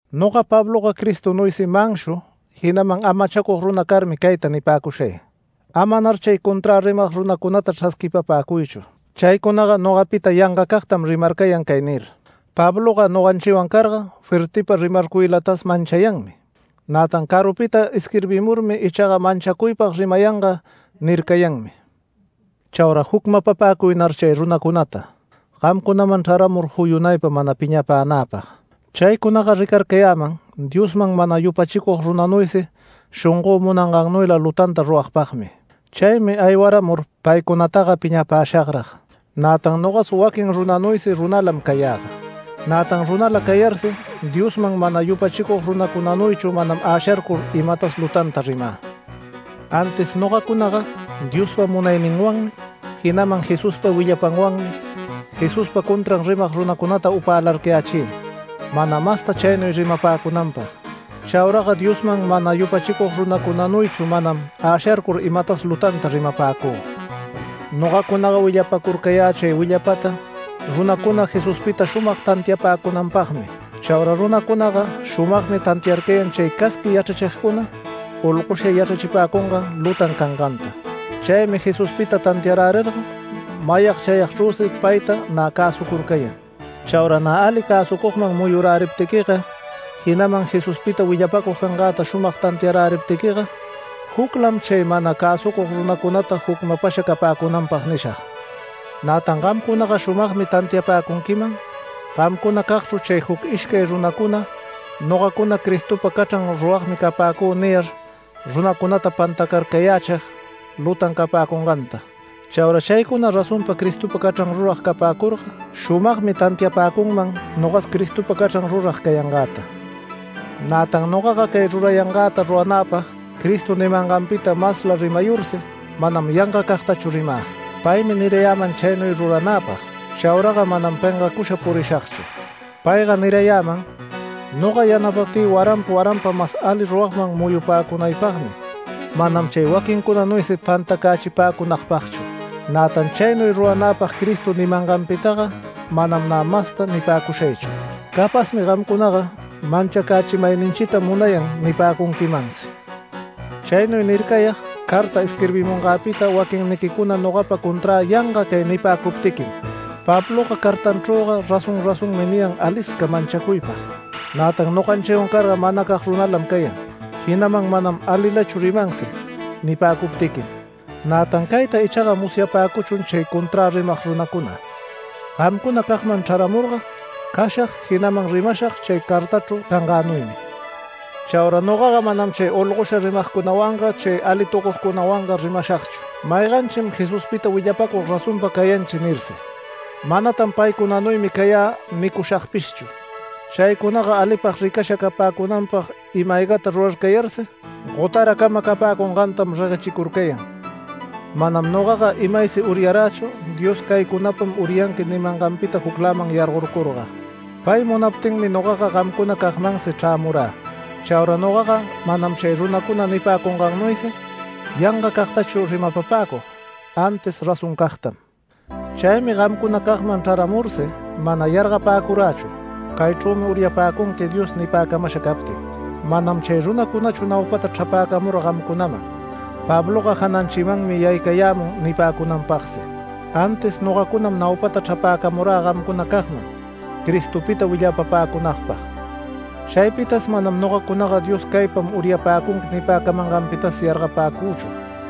Noga Pabloga Cristonuysi manshu, jinaman amachacug runa carmi cayta nipäcushay: Amanar chay conträ rimag runacunata chrasquipapäcuychu. Chaycunaga nogapita yangacagtam rimarcayan cay nir: “Pabloga noganchiwan carga fuertiypa rimarcuylatas manchayanmi, nätan carupita isquirbimurmi ichaga manchacuypag rimayanga” nircayanmi. Chaura jucmapapäcuynar chay runacunata gamcunam chraramur juyunaypa mana piñapänäpag. Chaycunaga ricarcayäman Diosman mana yupachicug runanuysi shongö munangannuyla lutanta ruragpagmi. Chaymi aywaramur paycunataga piñapäshagrag. Nätan nogas waquin runanuysi runalam cayäga, nätan runala cayarsi Diosman mana yupachicug runacunanuychu manam äsharcur imatas lutanta rimä. Antis nogacunaga Diospa munayninwanmi, jinaman Jesuspa willapanwanmi Jesuspa contran rimag runacunata upälarcayächï mana masta chaynuy rimapäcunanpag. Chauraga Diosman mana yupachicug runacunanuychu manam äsharcur imatas lutanta rimapäcü. Nogacunaga willapacurcayä chay willapata runacuna Jesuspita shumag tantiachipäcunanpagmi. Chaura runacunaga shumagmi tantiarcayan chay casqui yachrachigcuna olgosha yachrachipäcungan lutan canganta. Chaymi Jesuspita tantiarärirga mayag chayagchrüsi payta nä cäsucurcayan. Chaura nä ali cäsucugman muyuräriptiquiga, jinaman Jesuspita willapacug cangäta shumag tantiaräriptiquiga, juclam chay mana cäsucug runacunata jucmapasha capäcunanpag nishag. Nätan gamcunaga shumagmi tantiapäcunquiman gamcunacagchru chay juc ishcay runacuna “Nogacunaga Cristopa cachran ruragmi capäcü” niyar runacunata pantacarcayächig lutan capäcunganta. Chaura chaycuna razonpa Cristopa canchran rurag capäcurga shumagmi tantiapäcunman nogas Cristopa cachran rurag cayangäta. Nätan nogaga cay rurayangäta ruranäpag Cristo nimanganpita masla rimayursi manam yangacagtachu rimä. Paymi nirayäman chaynuy ruranäpag, chauraga manam pengacusha purishagchu. Payga nirayäman: “Noga yanapaptï waranpa waranpa mas alila ruragman muyupäcunaypagmi, manam chay waquincunanuysi pantacachipäcunagpagchu”. Nätan chaynuy ruranäpag Cristo nimanganpitaga manam nä masta nipäcushaychu. Capazmi gamcunaga “Manchacachimayninchitam munayan” nipäcunquimansi. Chaynuy nircayag carta isquirbimungäpita waquinniquicuna nogapa conträ yanga cay nipäcuptiquim: “Pabloga cartanchrüga razón razonmi niyan alisca manchacuypag, nätan noganchiwan carga manacag runalam cayan, jinaman manam alilachu rimansi” nipäcuptiquim. Nätan cayta ichaga musyapäcuchun chay conträ rimag runacuna. Gamcunacagman chrämurga cashag, jinaman rimashag chay cartächru cangänuymi. Chaura nogaga manam chay olgosha rimagcunawanga chay alitucugcunawanga rimashagchu “Mayganchim Jesuspita willapacug razonpa cayanchi” nirsi. Manatan paycunanuymi cayä nicushagpishchu. Chaycunaga alipag ricasha capäcunanpag ima-aygata rurarcayarsi gotaracama capäcungantam reguechicurcayan. Manam nogaga imaysi uryarächu Dios “Caycunapam uryanqui” nimanganpita jucläman yargorcurga. Pay munaptinmi nogaga gamcunacagmansi chrämurä. Chaura nogaga manam chay runacuna nipäcungannuysi yangacagtachu rimapapäcug, antis razoncagtam. Chaymi gamcunacagman chraramursi mana yargapäcurächu “Caychrümi uryapäcunqui” Dios nipäcamasha captin. Manam chay runacunachu naupata chrapäcamura gamcunaman, “Pabloga jananchimanmi yaycayämun” nipäcunanpagsi, antis nogacunam naupata chrapäcamurä gamcunacagman Cristopita willapapäcunagpag. Chaypitas manam nogacunaga “Dios caypam uryapäcunqui” nipäcamanganpitas yargapäcüchu.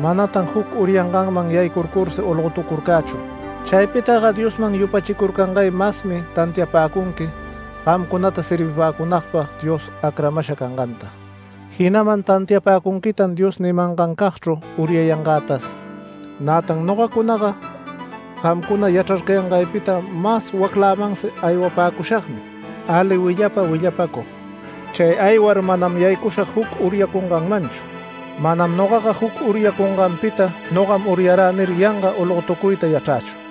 Manatan juc uryanganman yaycuyursi olgotucurcächu. Chaypitaga Diosman yupachicurcangay masmi tantiapäcunqui gamcunata servipäcunagpag Dios acramasha canganta, jinaman tantiapäcunquitan Dios nimangancagchru uryayangätas. Nätan nogacunaga gamcuna yachrarcayangaypita mas waclämansi aywapäcushagmi ali willapa willapacug. Chay aywar manam yaycushag juc uryacunganmanchu, manam nogaga juc uryacunganpita “Nogam uryarä” nir yanga olgotucuyta yachrächu.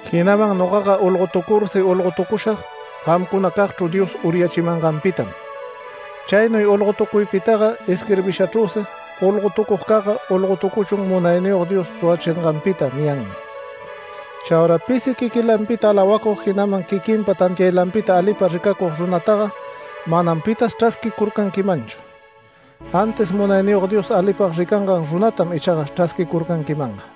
Jinaman nogaga olgotucursi, olgotucushag gamcunacagchru Dios uryachimanganpitam. Chaynuy olgotucuypitaga isquirbishachrüsi: “Olgotucugcagga olgotucuchun Munayniyog Dios rurachinganpita” niyanmi. Chaura pisi quiquilanpita alawacug, jinaman quiquinpa tantiaylapita alipag ricacug runataga manam pitas chrasquicurcanquimanchu, antis Munayniyog Dios alipag ricangan runatam ichaga chrasquicurcanquimanga.